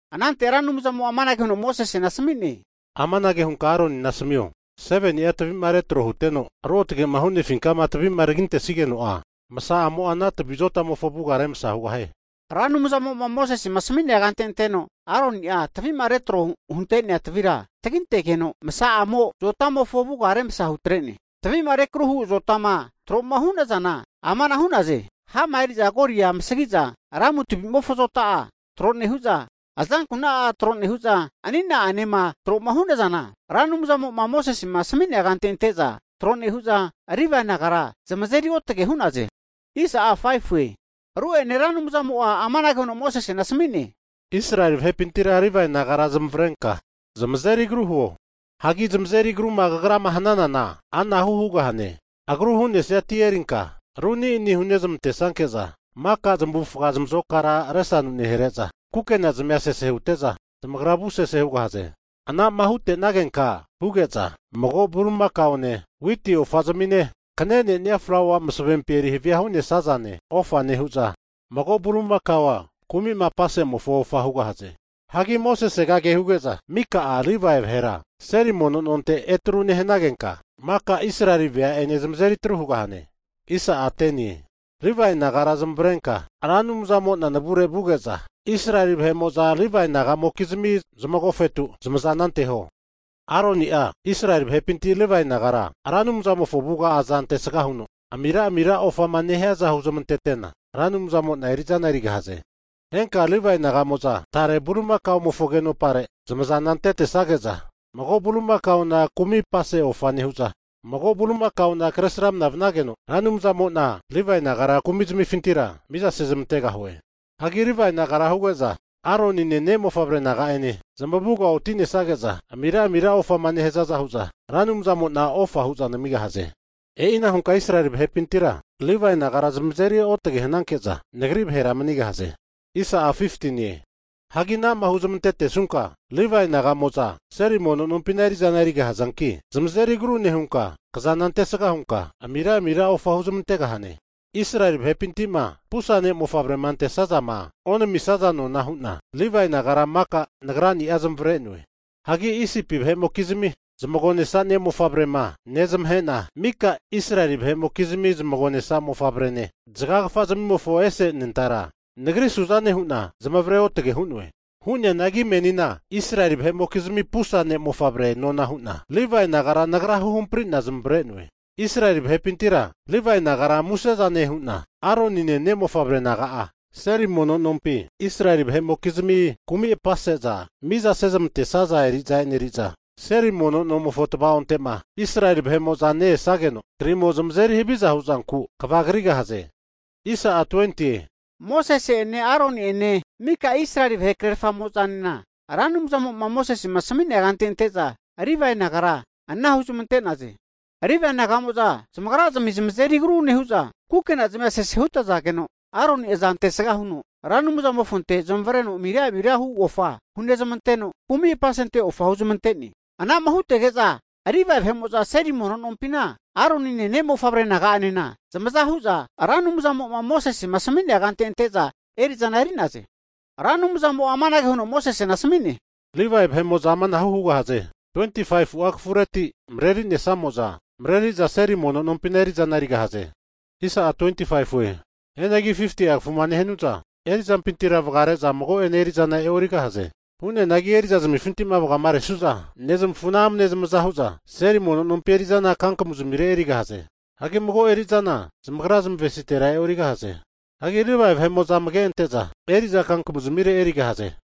Anante Ra Anumzamo'a amanage huno Mosesena asmi'ne, Amanage hunka Aronina asmio, 7ni'a tavi'ma retro huteno, ruotgema hunefinkama tavima tagintesigeno'a, masa'amo'a ana tavi azota'mofo avuga remsa hugahie. Ra Anumzamo'ma Mosesema asami'nea kante anteno Aroni'a tavi'ma retro hunte'nea tavira tagintegeno, masa'amo zota'mofo avuga remsa hutre'ne. Tavi'ma rekruhu azotama tro'ma hu'nazana amana hu'naze, hama eri'za golia amasagiza lamu tavimofo zota'a tro nehu'za, azankuna'a tro nehu'za anina'anema troma hunazana, Ra Anumzamo'ma Mosesema asami'nea kante ante'za tro nehu'za, Livae nagara zamazeri otage hu'naze. Ru'ene Ra Anumzamo'a amanage huno Mosesena asmi'ne, Israeli vahepintira Livae nagara zamavarenka, zamazeri agru huo. Hagi zamazeri agruma kagrama hananana anahu hugahane, agru hu'nesia ti erinka ru ani'ani hunezmantesanke'za, maka zamufa zamazokara resanu nehare'za, kukena zamia sese hute'za, zamagra avusese hugahaze. Ana'ma hutenagenka huge'za mago bulimakaone witi ofa zami'ne, kanenea flaua masavempi erihavia hu'nesazane ofa nehu'za, mago bulimakao kumi'ma apasezamante ofa hugahaze. Hagi Mosesega kehuge'za mika'a Livae vahera seli mono nonte etru nehanagenka, maka Israeli vea'ene zamazeri atru hugahane. Livae nagara zamavarenka Ra Anumzamo'na navure vuge'za, Israeli vahe'mo'za Livae naga'mokizmi zamagofetu zamaza anteho. Aroni'a Israeli vahepinti Livae nagra Ra Anumzamofo avuga aza ante'sga huno amira amira ofama nehiaza huzmantetena, Ra Anumzamo'na eri'zana erigahaze. Henka'a Livae naga'mo'za tare bulimakaomofo agenopare zamazana antetesage'za, mago bulimakaona kumi'apase ofa nehu'za, mago bulimakaona kresramna vanage'na Ra Anumzamo'na Livae nagara kumizmifintira mizasezmantegahue. Hagi Livae nagara huge'za Aronine, ne'mofavre naga'ane zamuga oti'nesage'za, amira amira ofama nehazaza hu'za Ra Anumzamo'na ofa hu'za namigahaze. E'ina hunka Israeli vahepintira Livae nagara zamazeri otage hananke'za Nagri vahera manigahaze. Hagi anama huzmantetesunka, Livae naga'mo'za seli mono nompina eri'zana erigahazanki, zamazeri agru nehunka, kazana antesga hunka amira amira ofa huzmantegahane. Israeli vahepinti'ma pusa ne' mofavrema antesazama onamisaza nona hu'na, Livae nagara maka Nagrani'a zamavare'noe. Hagi Isipi vahe'mokizmi zamagonesa ne'mofavrema nezmahe'na, mika'a Israeli vahe'mokizmi zamagonesa mofavrene, zagagafa zimimofo ese anentara Nagri suzane hu'na zamavare otage hu'noe. Hu'neanagi menina Israeli vahe'mokizmi pusa ne'mofavre nona hu'na, Livae nagara Nagra huhampri'na zamavare'noe. Israeli vahepintira, Livae nagara muse'zane hu'na Aronine, ne'mofavre naga'a seli mono nompi Israeli vahe'mokizmi kumi' apaseza miza sezmante'saza eri'za eneri'za, seli mono nomofo tvaonte'ma Israeli vahe'mo'zama ne-esageno krimo zamazeri haviza huzanku kva krigahaze. Mosese'ene, Aroni'ene mika Israeli vahe krerfamo'zanena Ra Anumzamo'ma Mosese asmi'nea kante ante'za Livae nagara anara huzmantegahaze. Livae naga'mo'za zamagrazmi zamazeri agru nehu'za, kukena zmia sese hutazageno, Aroni aza ante sga huno Ra Anumzamofonte zamavareno amira amira hu ofa hunezmanteno, kumi apase ofa huzmante'ne. Ana'ma hutege'za Livae vahe'mo'za seli mono nompina, Aronine, ne'mofavre naga'anena zamaza hu'za Ra Anumzamo'ma Mosesema asami'nea kante ante'za eri'zana eri'naze. Ra Anumzamo'a amanage huno Mosesena asmi'ne, Livae naga'mo'za amanahu hugahaze, 25'a kafureti mareri'nesnamo'za, mareri'za seli mono nompina eri'zana erigahaze. Hianagi 50'a kafuma nehanu'za eri'zampintira vagare'za mago'ene eri'zana e'origahaze. Hu'neanagi eri'zazamifinti vagaresu'za nezmafuna amne zamaza hu'za seli mono nompi eri'zana kankamu zamire erigahaze. Hagi mago eri'zana zamagra zamavesitera e'origahaze. Hagi Livae vahe'mo'za amage ante'za eri'za kankamu zamire erigahaze.